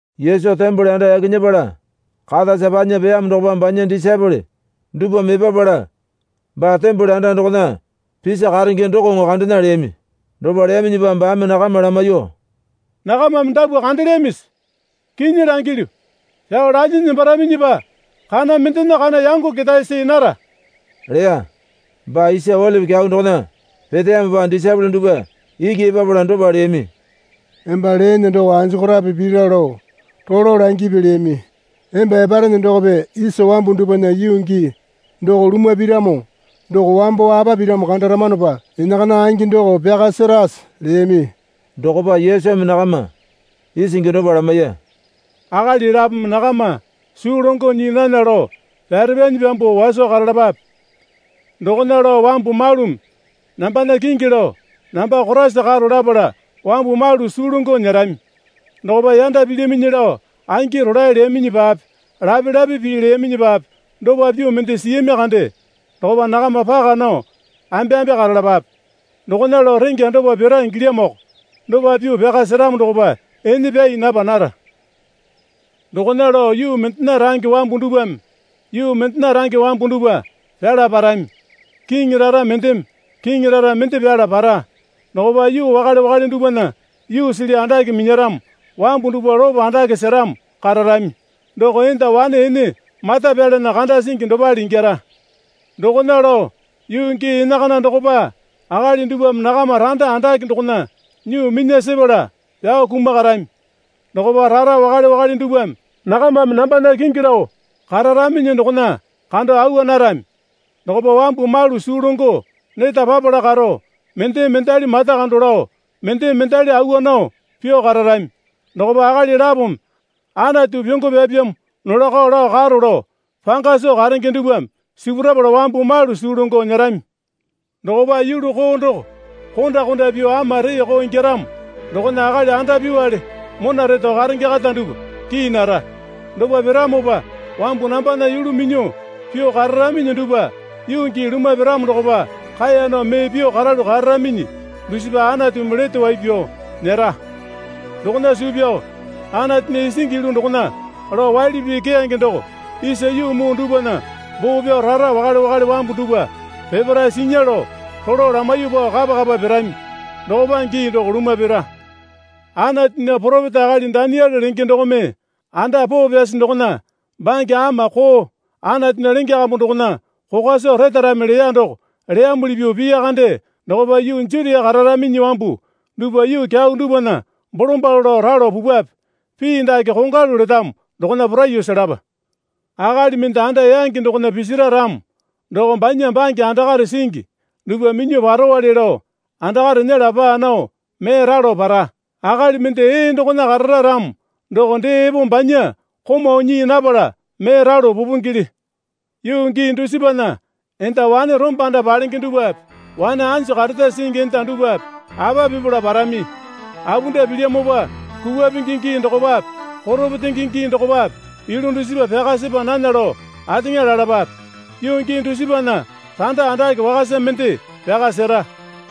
Yesu tembole anda yaki nyepala katasa panya peyamo dokopa banya disaepole dupwame epapala baa tembole anda dokona pisi karenge dokoŋo kandena leyami. Dopa leyaminyipa baame nakama lamaiyuo, Nakamame dapwa kandelyamisi? Kinyi langilyu, Pyao lalyinyi nembaraminyipa kana mendena kana yango ketae see nara, leya. Baa Isa Olipi Kyau dokona peteyamopa disaepole dupwa iki epapala dopa leyami. Emba leene doko anjokorape pira lao rolo langipi leyami. Emba eparene dokope isa wambu dupwana yuu gii doko lumwa piramo doko wambo apa piramo kandaramanopa enakana angi doko pyaka serase? leyami. Dokopa Yesumi nakama isingi dopa lamaiya. Akali lapome nakama suu longo nyii nana lao pyare pyanyi pyambuo waso karalapape. Dokona lao wambu malumi nambana kingi lao, Namba Koraisa karo lapala wambu malu suu longo nyerami. Dokopa yanda pilyaminyi lao angi rolae leyaminyipape lape lape pii leyaminyipape dopa pyuo mende siyami kande dokopa nakama paka nao ambeambe karalapape. Dokona lao rengya dopa pira ingilyamoko. Dopa pyuo pyaka seramo dokopa ene pyai napa nara. Dokona lao yuu mendena range wambu dupwame yuu mendena range wambu dupwa pyala parami. Kiŋi rara mendeme kiŋi rara mende pyala para. Dokopa yuu wakale wakale dupwana yuusili andake minyaramo wambu dupwa lopo andake seramo kararami. Doko enda wane ene mata pyalana kanda singi dopale ingyara. Dokona lao yuu gii enakana dokopa akali dupwame nakama randa andake dokona nyuo minya sepala pyao kumakarami. Dokopa rara wakale wakale dupwame nakamame nambana kingi lao kararaminyi dokona kando awa narami. Dokopa wambu malu suu longo neta papala karo, mendeme mendali mata kando lao, mendeme mendali awa nao pyuo kararami. Dokopa akali lapome, Anatu pyongo pyapyamo nolako lao karo lao panga soo karenge dupwame sipurapala wambu malu suu longo nyerami. Dokopa yulu koo doko konda konda pyuo ama reeko ingyaramo dokona akali andapyuwale mona reto karenge kata dupwa kii nara. Dopa piramopa wambu nambana yulu minyuo pyuo kararaminyi dupwa yuu gii lumwa piramo dokopa kaeya nao mee pyuo karalu kararaminyi dusipa Anatumi lete wai pyao nyera. Dokona suu pyao Anatunya isingi yulu dokona lao waili pii keyange, doko isa yuu muu dupwana boo pyao, rara wakale wakale wambu dupwa peparae sinya lao, rolo lamaiyuo pao kapa kapa pirami dokopa gii doko lumwa pira. Anatunya poropeta akali Daniele lenge dokome, Anda poo pyasi dokona bange ama koo Anatunya lenge kambu dokona kokwa soo retarami leya doko leyamuli pyuo piya kande dokopa yuu Jutia kararaminyi wambu dupwa yuu kyau dupwana bolombalo lao ralo pupwape. (Pii dake kongwalu letamo dokona poraiyuo selapa.) Akali mende anda yangi dokona pisira ramo doko banya bange andakare singi dupwa minyuo parowale lao andakare nyela paa nao mee ralo para. Akali mende ee dokona karara ramo doko dee epo banya komau nyii napala mee ralo pupingele. Yuu gii dusipana enda wane rombanda palenge dupwape wane anju kareta singi enda dupwape apa pipala parami? Apunda pilyamopa kupwa pingi gii dokopape koro petenge dokopape yulu dusipa pyaka sepa nana lao ateŋa lalapape. Yuu gii dusipana randa andake wakasa mende pyaka sera.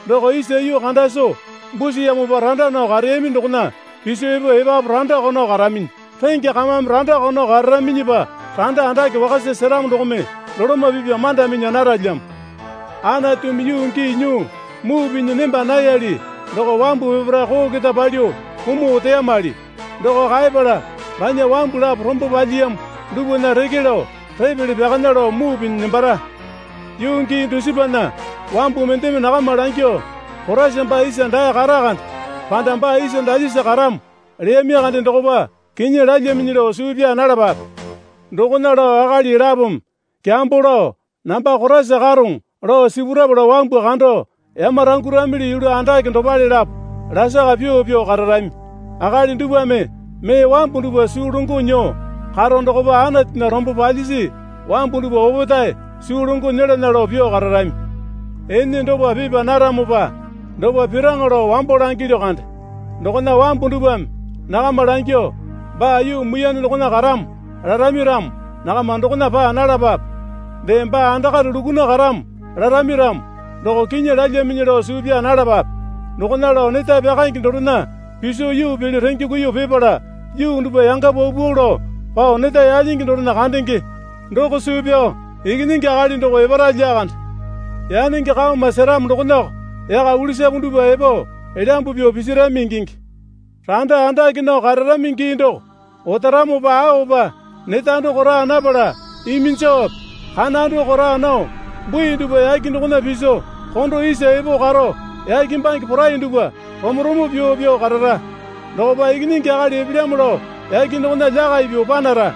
Doko isa yuu kanda soo busiyamopa randa nao kareyami dokona piso epo epapu randako nao karaminyi, rengya kamame randako nao kararaminyipa randa andake wakasa seramo dokome doloma pipya manda minya naralyamo. Anatumi yuu gii nyuo muu pinyi nemba nayali doko wambu peparae koo keta palyuo kumuo oteyamuli. Doko kaepala banya wambu lapo rombo palyiyamo dupwana reke lao repele pyakanya lao muu pinyi nembara. Yuu gii dusipana wambu mendeme nakama langyuo, Koraisa baa isa dae kata kande, panda, Baa isa dalyesa karamo leyami kande dokopa kinyi lalyaminyi lao suu pyaa nalapape. Dokona lao akali lapome kyambo lao, Namba Koraisa karoŋo, lao sipurapala wambu kando yamaranguramili yulu andake dopale lapo lasaka pyuo pyuo kararami. Akali dupwame mee wambu dupwa suu longo nyuo karo dokopa Anatunya rombo palyisi wambu dupwa opetae suu longo nyelana lao pyuo kararami. Ene dopa pipa naramopa dopa piraŋa lao wambo langilyu kande. Dokona wambu dupwame nakama langyuo, Baa yuu muiyane dokona karamo larami ramo nakama dokona paa nalapape. Dee, Baa andakare lukuna karamo larami ramo doko kinyi lalyaminyi lao suu pyaa nalapape. Dokona lao neta pyakaenge dorena piso yuu pele renge kuiyuo pipala, yuu dupwa yanga paupau lao pao neta yalyingi dorena kandenge doko suu pyao Ikinyingi Akali doko epara lyakande. Yanenge kaoma seramo dokonako yaka ulisapu dupwa epo elyambu pyuo pisirami ingingi. Randa andake nao kararami gii doko otaramopa aopa neta doko raa napala iminjowape, kana doko raa nao, bui dupwa yake dokona piso kondo isa epo karo yake bange porai dupwa romo romo pyuo pyuo karara. Dokopa Ikinyingi Akali epelyamo lao yake dokona lyakai pyuo panara.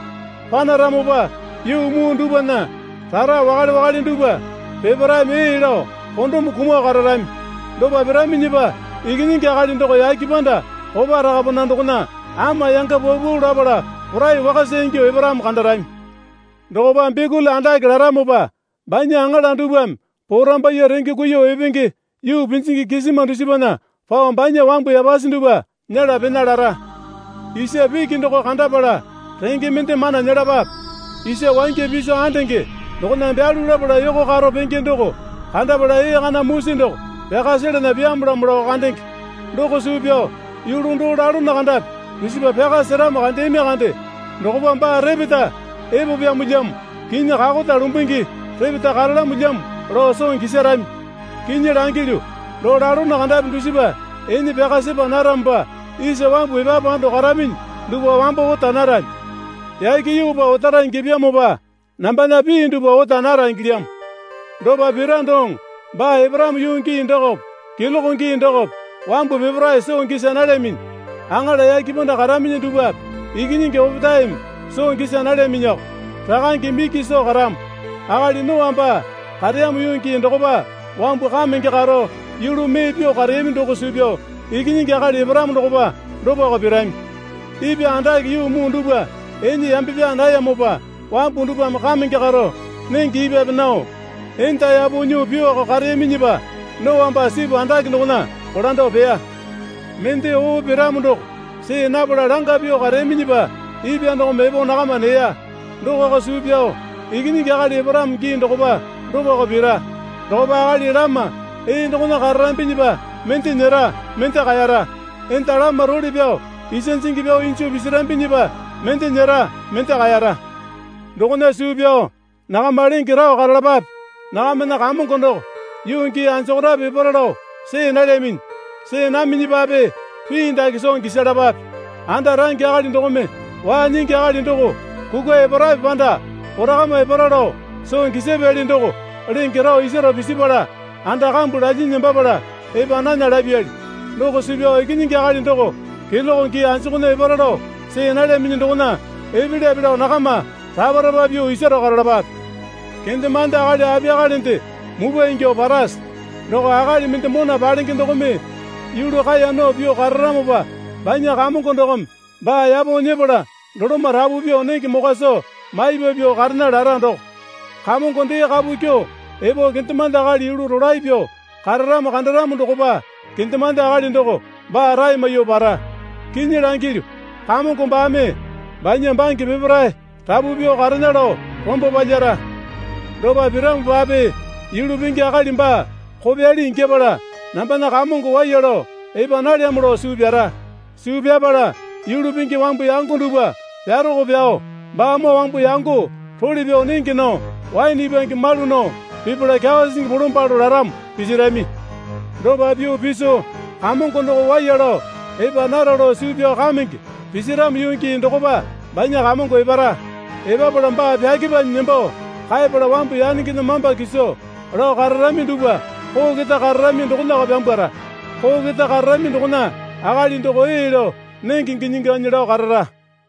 Panaramopa yuu muu dupwana rara wakale wakale dupwa peparaeme ee lao kondome kumuo kararami. Dopa piraminyipa Ikinyingi Akali doko yake panda kopa rakapana dokona ama yanga paupau lapala porai wakasa ingyuo eparamo kandarami. Dokopa bikuli andake laramopa banya aŋala dupwame porambaiye renge kuiyuo epenge yuu pinjingi kisima dusipana pao banya wambu yapasi dupwa nyela pena lara. Isa piki doko kandapala renge mende mana nyelapape. Isa wangya piso andenge dokona byalu lapala yoko karo penge doko kandapala ee kana musi doko pyaka selana pyamolamo lao kandenge. Doko suu pyao yulu doo lalono kandapi dusipa pyaka seramo kandeyami kande dokopa baa repeta epo pyamolyamo, kinyi kakota lumbungi repeta karalamolyamo, lao soo gisarami. Kinyi langilyu, doo lalono kandapi dusipa ene pyaka sepa naramopa isa wambu epapu ando karaminyi dupwa wambo ota narami. Yake yuupa otara ingyapyamopa nambana pii dupwa ota nara ingilyamo. Dopa pira doŋo baa eparamo yuu gii dokope keloke gii dokope wambu peparae soo gisa nalyaminyi. Aŋala yake panda karaminyi dupwape Ikinyingi opetaeme soo gisa nalyaminyiko. Rakangeme iki soo karamo. Akali Noa baa kareyamo yuu gii dokopa wambu kamenge karo yulu mee pyuo kareyami doko suu pyao Ikinyingi Akali eparamo dokopa dopako pirami. Ipwa andake yuu muu dupwa ene yambe pyaa nayamopa wambu dupwame kamenge karo, nenge ipwape nao, enda yapo nyuo pyuoko kareyaminyipa, Noa baa sipu andake dokona kolando peya. Mende oo piramo doko see napala langa pyuo kareyaminyipa ipwa dokome epo nakama neya. Dokoko suu pyao Ikinyingi Akali eparamo gii dokopa dopako pira. Dokopa akali lama ee dokona kararambinyipa mende nyera, mende kaeyara. Enda lama role pyao isa jingi pyao injo pisirambinyipa mende nyera mende kaeyara. Dokona suu pyao nakama lenge rao karalapape. Nakamana Kamongo doko yuu gii anjokorape epara lao see nalyaminyi. See naminyipape pii dake soo gisalapape. Anda range akali dokome waa nyingi akali doko kukwa eparape panda korakama epara lao soo gisapyali doko lenge rao isaro pisipala anda kambu lalyinyi nembapala epa nana lapyali. Doko suu pyao Ikinyingi Akali doko keloke gii anjukunya epara lao see nalyaminyi dokona epelyape lao nakama rapa rapa pyuo isaro karalapape. Kendemande akali apiyakalende mupwa ingyuo parase? Doko akali mende mona palenge dokome yulu kaeya nao pyuo kararamopa banya kamongo dokome baa yapo nyepala doloma rapu pyuo nenge mokwa soo maipa pyuo karena lara doko. Kamongo dee kapu kyuo epo kendemande akali yulu rolae pyuo kararamo kandaramo dokopa kendemande akali doko baa rae maiyuo para. Kinyi langilyu, kamongo baame banya bange peparae rapu pyuo karena lao rombo palyara. Dopa piramopape yulu pingi akali baa kopyali ingyapala, Nambana kamongo waiya lao epa nalyamo lao suu pyara. Suu pyapala yulu pingi wambu yango dupwa pyaroko pyao baamoo wambu yango role pyao nenge nao waene ipwange malu nao pipala kyawa sisingi bolombalo laramo pisirami. Dopa pyuo piso kamongo doko waiya lao epa nara lao suu pyao kamenge pisiramo yuu gii dokopa banya kamongo epara. Epapala baa pyakepanyi nembo kaepala wambu yanengena mamba kiso lao kararami dupwa koo keta kararami dokonako pyambwara. Koo keta kararami dokona akali doko ee lao nenge ginyi ganyi lao karara.